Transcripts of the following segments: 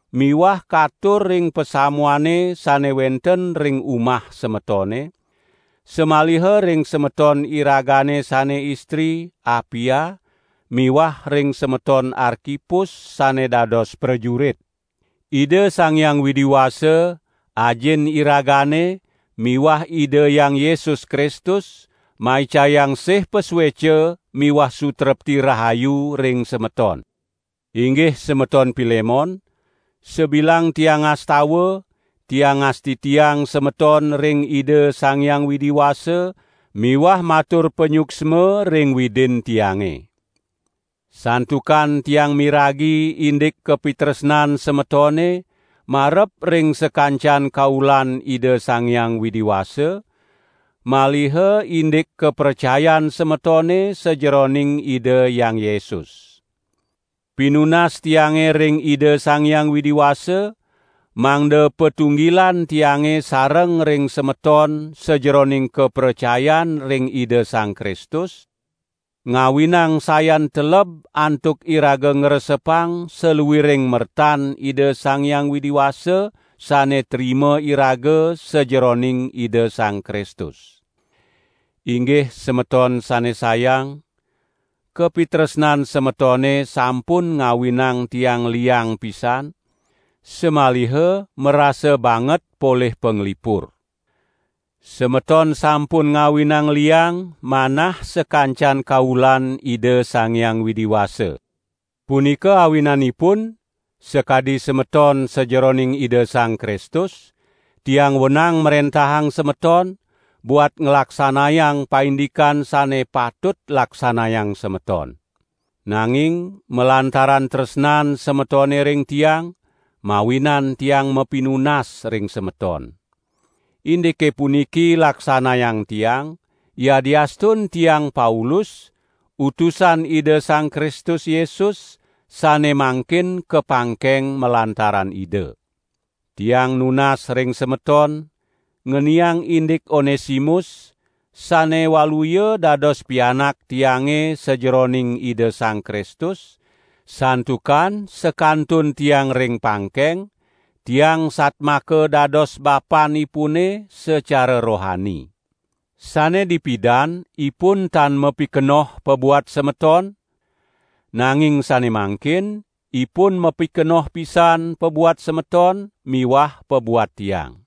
miwah katur ring pasamuane sane wenten ring umah semetone, samaliha ring semeton iragane sane istri, Apia miwah ring semeton Arkipus sane dados prajurit. Ida Sang Hyang Widi Wasa, Ajin iragane miwah Ida Hyang Yesus Kristus maicayang sih pasueca miwah sutrepti rahayu ring semeton. Inggih semeton Pilemon, sabilang tiang ngastawa, tiang ngastitiang semeton ring Ida Sang Hyang Widi Wasa miwah matur panyuksma ring Widin tiange. Santukan tiang miragi indik kapitresnan semetone marep ring sakancan kaulan Ida Sang Hyang Widi Wasa, maliha indik kapracayan semetone sajeroning Ida Hyang Yesus. Pinunas tiange ring Ida Sang Hyang Widi Wasa, mangda patunggilan tiange sareng ring semeton sajeroning kapracayan ring Ida Sang Kristus, ngawinang sayan teleb antuk iraga ngresepang saluiring mertan Ida Sang Hyang Widi Wasa sane trima iraga sajeroning Ida Sang Kristus. Inggih semeton sane sayang, kapitresnan semetone sampun ngawinang tiang liang pisan, samaliha marasa banget polih panglipur. Semeton sampun ngawinang liang manah sakancan kaulan Ida Sang Hyang Widi Wasa. Punika awinanipun, sakadi semeton sajeroning Ida Sang Kristus, tiang wenang mrentahang semeton, buat nglaksanayang paindikan sane patut laksanayang semeton. Nanging malantaran tresnan semetone ring tiang, mawinan tiang mapinunas ring semeton. Indike puniki laksanayang tiang, yadiastun tiang Paulus, utusan Ida Sang Kristus Yesus, sane mangkin kapangkeng malantaran Ida. Tiang nunas ring semeton, ngeniang indik Onesimus, sane waluya dados pianak tiange sajeroning Ida Sang Kristus, santukan sakantun tiang ring pangkeng, tiang satmaka dados bapanipune sacara rohani. Sane dipidan ipun tan mapikenoh pabuat semeton, nanging sane mangkin ipun mapikenoh pisan pabuat semeton miwah pabuat tiang.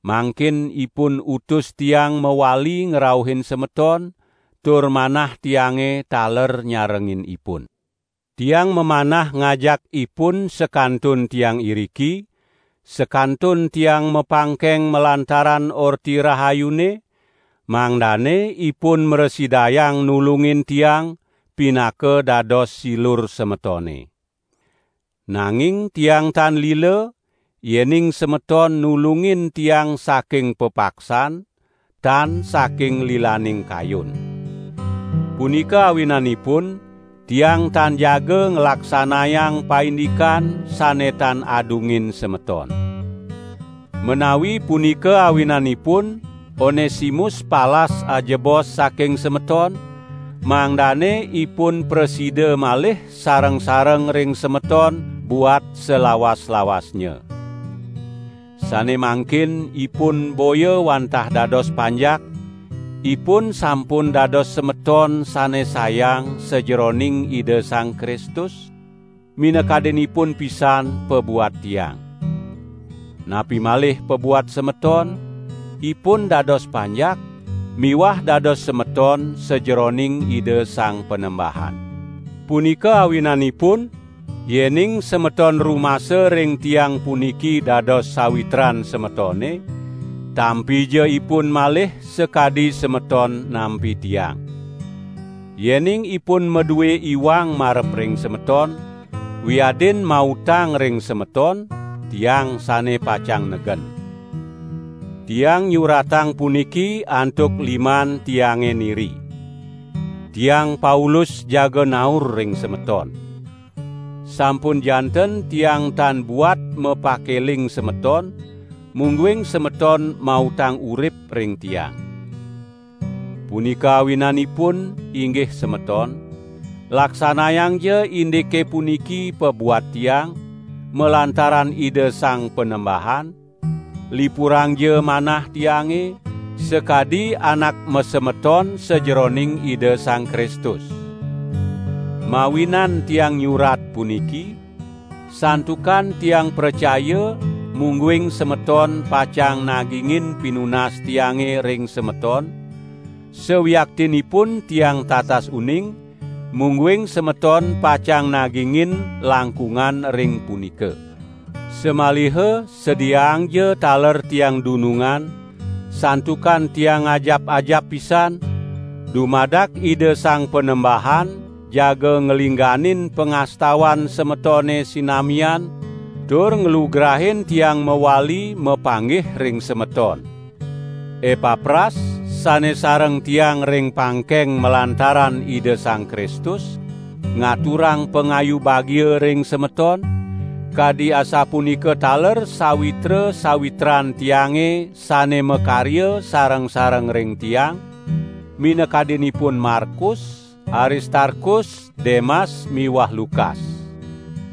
Mangkin ipun utus tiang mawali ngrauhin semeton tur manah tiange taler nyarengin ipun. Tiang mamanah ngajak ipun sakantun tiang iriki, sakantun tiang mapangkeng malantaran Orti Rahayune, mangdane ipun mrasidayang nulungin tiang, pinaka dados silur semetone. Nanging tiang tan lila, yening semeton nulungin tiang saking pepaksan, tan saking lilaning kayun. Punika awinanipun tiang tan jaga nglaksanayang paindikan sane tan adungin semeton. Menawi punika awinanipun Onesimus palas ajebos saking semeton, mangdane ipun prasida malih sareng-sareng ring semeton buat salawas-lawasnya. Sane mangkin ipun boya wantah dados panjak; ipun sampun dados semeton sane sayang sajeroning Ida Sang Kristus; minakadinipun pisan pabuat tiang. Napi malih pabuat semeton, ipun dados panjak, miwah dados semeton sajeroning Ida Sang Panembahan. Punika awinanipun, yening semeton rumasa ring tiang puniki dados sawitran semetone, tampija ipun malih sakadi semeton nampi tiang. Yening ipun madue iwang marep ring semeton, wiadin mautang ring semeton, tiang sane pacang negen. Tiang nyuratang puniki antuk liman tiange niri: Tiang Paulus jaga naur ring semeton! (Sampun janten tiang tan buat mapakeling semeton, mungguing semeton mautang urip ring tiang.) Punika awinanipun, inggih semeton, laksanayangja indike puniki pabuat tiang, malantaran Ida Sang Panembahan; lipurangja manah tiange, sakadi anak masemeton sajeroning Ida Sang Kristus! Mawinan tiang nyurat puniki, santukan tiang pracaya mungguing semeton pacang nagingin pinunas tiange ring semeton, sawiaktinipun tiang tatas uning, mungguing semeton pacang nagingin langkungan ring punika. Samaliha sediaangja taler tiang dunungan, santukan tiang ngajap-ajap pisan, dumadak Ida Sang Panembahan jaga nglingganin pangastawan semetone sinamian tur nglugrain tiang mawali mapanggih ring semeton. Epapras, sane sareng tiang ring pangkeng malantaran Ida Sang Kristus, ngaturang pangayu bagia ring semeton, kadi asapunika taler sawitra-sawitran tiange sane makarya sareng-sareng ring tiang, minakadinipun Markus, Aristarkus, Demas miwah Lukas.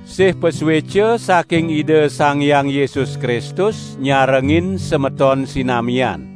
Sih pasueca saking Ida Sang Hyang Yesus Kristus nyarengin semeton sinamian.